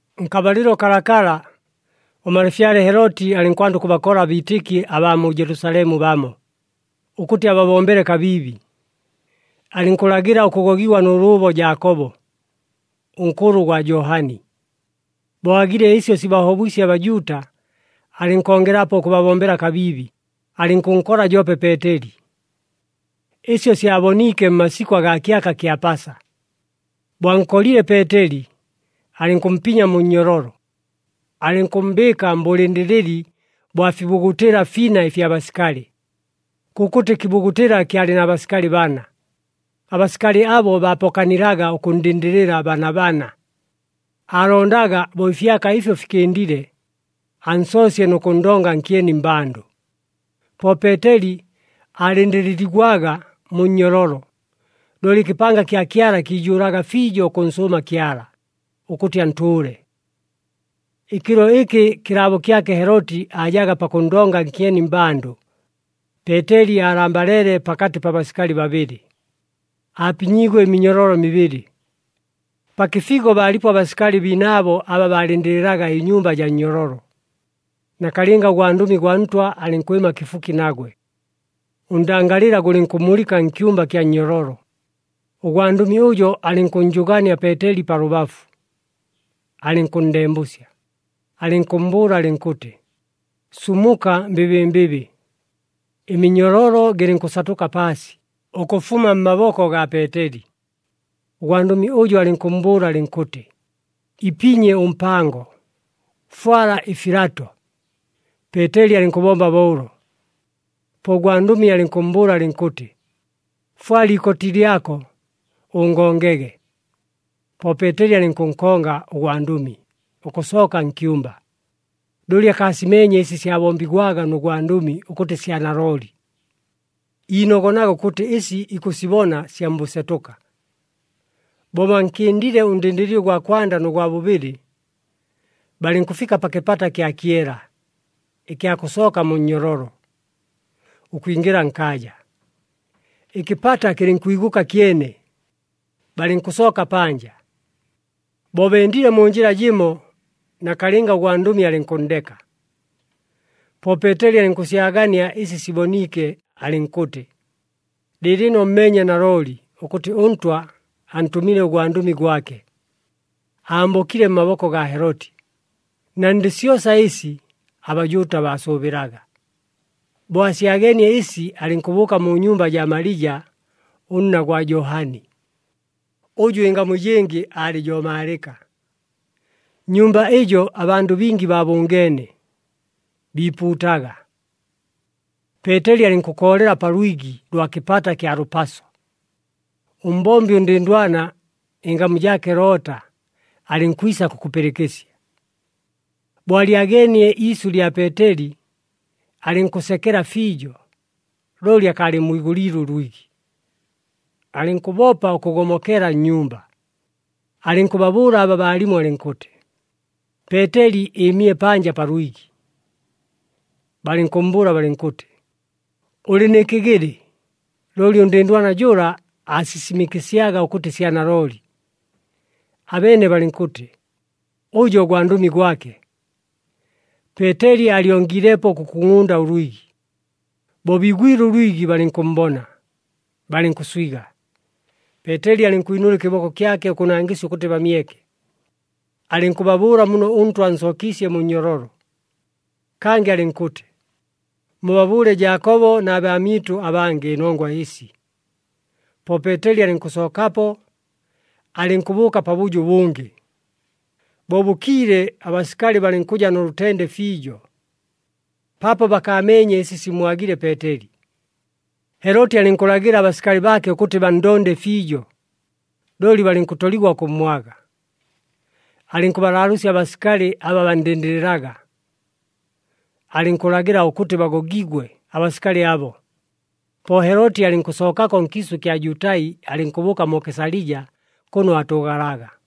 Nkabalɨlo kalakala, ʉmalafyale Heloti alɨnkwanda ʉkʉbakola abiitɨki abaa mu Jelusalemu bamo, ʉkʉtɨ ababombele kabiibi. Alɨnkʉlagɨla ʉkʉgogigwa nʉ lʉʉbo Jaakobo, ʉnkʉlʉ gwa Johani. Bo aagile ɨsyo sibahobwisye aBajuuta, alɨnkongelapo ʉkʉbabombela kabiibi, alɨnkʉnkola joope Peeteli. Ɨsyo syaboniike mmasikʉ agaa kyaka kya Pasa. Bo ankolile Peeteli, alɨnkʉmpinya mu nnyololo, alɨnkʉmmbɨɨka mbʉlɨndɨlɨli bwa fibugutɨla fina ɨfya basikali, kʉkʉtɨ kɨbugutɨla kyalɨ na basikali bana. Abasikali abo baapokanilaga ʉkʉnndɨndɨlɨla bana bana. Aalondaga bo ɨfyaka ɨfyo fikɨndile, ansoosye nʉ kʉnndonga nkyeni mmbandʉ. Po Peeteli aalɨndɨlɨligwaga mu nnyololo, looli ɨkɨpanga kya Kyala kiijʉʉlaga fiijo ʉkʉnsʉʉma Kyala, ʉkʉtɨ antʉʉle. Ɨkɨlo ɨkɨ kɨlaabo kyake Heloti aajaga pakʉnndonga nkyeni mmbandʉ, Peeteli aalambaleele pakatɨ pa basikali babɨlɨ, aapinyiigwe ɨminyololo mibɨlɨ. Pa kɨfigo baalipo abasikali biinaabo aba baalɨndɨlɨlaga ɨnyumba jaa nnyololo. Nakalɨnga ʉgwandʉmi gwa Ntwa alɨnkwɨma kɨfuki nagwe, ʉndangalɨla gʉlɨnkʉmulɨka nkyumba kya nnyololo. Ʉgwandʉmi ʉjo alɨnkʉnnjʉgaania Peeteli pa lʉbafu, alɨnkʉnndembʉsya, alɨnkʉmmbʉʉla alɨnkʉtɨ, “Sumuka mbɨbɨmbɨbɨ!” Ɨminyololo gɨlɨnkʉsatʉka paasi, ʉkʉfuma mmaboko gaa Peeteli! Ʉgwandʉmi ʉjo alɨnkʉmmbʉʉla alɨnkʉtɨ, “Ipinye ʉmpango, fwala ɨfilato.” Peeteli alɨnkʉbomba bo ʉlo, po ʉgwandʉmi alɨnkʉmmbʉʉla alɨnkʉtɨ, “Fwala ikoti lyako, ʉngongege!” Po Peeteli alɨnkʉnkonga ʉgwandʉmi, ʉkʉsooka nkyumba. Looli akaasimeenye ɨsi syabombigwaga nʉ gwandʉmi ʉkʉtɨ sya nalooli, iinogonaga ʉkʉtɨ ɨsi ikʉsibona sya mbʉsetʉka. Bo bankɨndile ʉndɨndɨlɨli ʉgwa kwanda nʉ gwa bʉbɨlɨ, balɨnkʉfika pa kɨpata kya kyela, ɨkya kʉsooka mu nnyololo, ʉkwingɨla nkaaja. Ɨkɨpata kɨlɨnkwigʉka kyene, balɨnkʉsooka panja. Bo bendile mu njɨla jɨmo, nakalɨnga ʉgwandʉmi alɨnkʉnndeka. Po Peeteli alɨnkʉsyagania ɨsi siboniike, alɨnkʉtɨ, “Lɨɨlɨno mmeenye nalooli ʉkʉtɨ ʉNtwa antʉmile ʉgwandʉmi gwake, ambokile mmaboko gaa Heloti, na ndɨ syosa ɨsi aBajuuta baasʉʉbɨlaga.” Bo asyageenie ɨsi, alɨnkʉbʉʉka mu nyumba jaa Malija, ʉnna gwa Johani, ʉjʉ ɨngamu ɨjɨngɨ aalɨ jo Maalɨka. Nnyumba ɨjo abandʉ bingi baabʉngeene, biipuutaga. Peeteli alɨnkʉkoolela pa lwigi lwa pa kɨpata kya lʉpaso. Ʉmbombi ʉndɨndwana, ɨngamu jaake Loota, alɨnkwisa kʉkʉpɨlɨkɨsya. Bo alyageenie iisyʉ lya Peeteli, alɨnkʉsekela fiijo, looli akaalɨmmwigʉliile ʉlwigi. Alɨnkʉbopa ʉkʉgomokela nnyumba, alɨnkʉbabʉʉla aba baalimo alɨnkʉtɨ, “Peeteli ɨɨmile panja pa lwigi!” Balɨnkʉmmbʉʉla balɨnkʉtɨ, “Ʉlɨ nɨ kɨgɨlɨ!” Looli ʉndɨndwana jʉla, aasisimɨkɨsyaga ʉkʉtɨ sya nalooli. Abeene balɨnkʉtɨ, “Ʉjo gwandʉmi gwake.” Peeteli aalyongiilepo ʉkʉkungʼunda ʉlwigi. Bo biigwile ʉlwigi, balɨnkʉmmbona, balɨnkʉswiga. Peeteli alɨnkwinʉla ɨkɨboko kyake ʉkʉnangɨsya ʉkʉtɨ bamyeke. Alɨnkʉbabʉʉla muno ʉNtwa ansookiisye mu nnyololo. Kangɨ alɨnkʉtɨ, “Mubabʉʉle Jaakobo, na baamyɨtʉ abangɨ, ɨnongwa ɨsi.” Po Peeteli alɨnkʉsookapo, alɨnkʉbʉʉka pabʉjo ʉbʉngɨ. Bo bʉkiile, abasikali balɨnkʉja nʉ lʉtende fiijo, paapo bakaameenye ɨsi simmwagile Peeteli. Heloti alɨnkʉlagɨla abasikali baake ʉkʉtɨ banndonde fiijo, looli balɨnkʉtoligwa ʉkʉmmwaga. Alɨnkʉbalaalʉʉsya abasikali aba banndɨndɨlɨlaga, alɨnkʉlagɨla ʉkʉtɨ bagogigwe abasikali abo. Po Heloti alɨnkʉsookako nkiisʉ ɨkya Jutai, alɨnkʉbʉʉka mu Kesalija, kʉno aatʉʉgalaga.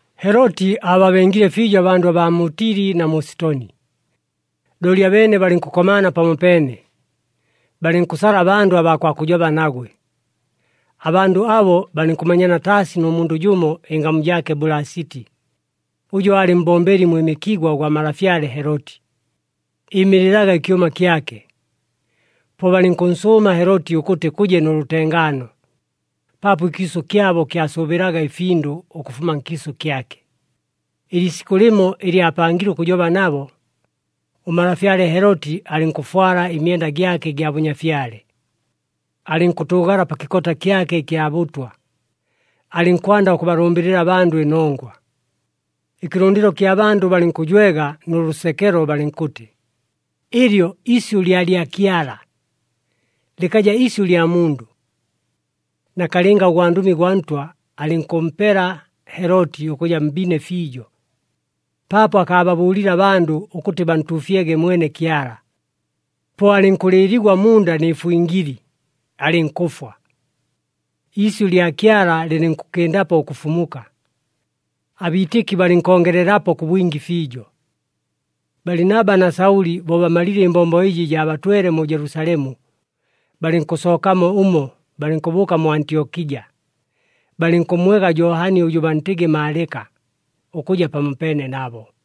Heloti aababengile fiijo abandʉ baa mu Tili na mu Sitoni. Looli abeene balɨnkʉkomaana pamopeene, balɨnkʉsala abandʉ abaa kwa kʉjoba nagwe. Abandʉ abo balɨnkʉmanyana taasi nʉ mundʉ jʉmo ɨngamu jaake Bulasiti, ʉjʉ aalɨ mbombeli mwɨmɨkigwa ʉgwa malafyale Heloti, ɨɨmɨlɨlaga ɨkyʉma kyake. Po balɨnkʉnsʉʉma Heloti ʉkʉtɨ kʉje nʉ lʉtengaano, paapo ɨkiisʉ kyabo kyasʉʉbɨlaga ɨfindʉ, ʉkʉfuma nkiisʉ kyake. Ɨliisikʉ lɨmo ɨlɨ aapangile ʉkʉjoba nabo, ʉmalafyale Heloti alɨnkʉfwala ɨmyenda gyake ɨgya bʉnyafyale, alɨnkʉtʉʉgala pa kɨkota kyake ɨkya bʉtwa, alɨnkwanda ʉkʉbalʉmbɨlɨla abandʉ ɨnongwa. Ɨkɨlʉndɨlo kya bandʉ balɨnkʉjwega nʉ lʉsekelo balɨnkʉtɨ, “Ɨlyo isyʉ lya lyakyala! Lɨkaja isyʉ lya mundʉ!” Nakalɨnga ʉgwandʉmi gwa Ntwa alɨnkʉpela Heloti ʉkʉja mbine fiijo, paapo akaababʉʉlile abandʉ ʉkʉtɨ bantuufyege mwene Kyala. Po alɨnkʉlɨɨligwa munda nɨ fwingili, alɨnkʉfwa. Iisyʉ lya Kyala lɨlɨnkʉkɨndapo ʉkʉfumuka, abiitɨki balɨnkongelelapo kʉ bwingi fiijo. Balinaba na Saʉli bo bamalile ɨmbombo ɨjɨ jaabatwele mu Jelusalemu, balɨnkʉsookamo ʉmo balɨnkʉbʉʉka mu Antyokija, balɨnkʉmmwega Johani ʉjʉ bantɨgɨ Maalɨka, ʉkʉja pamopeene nabo.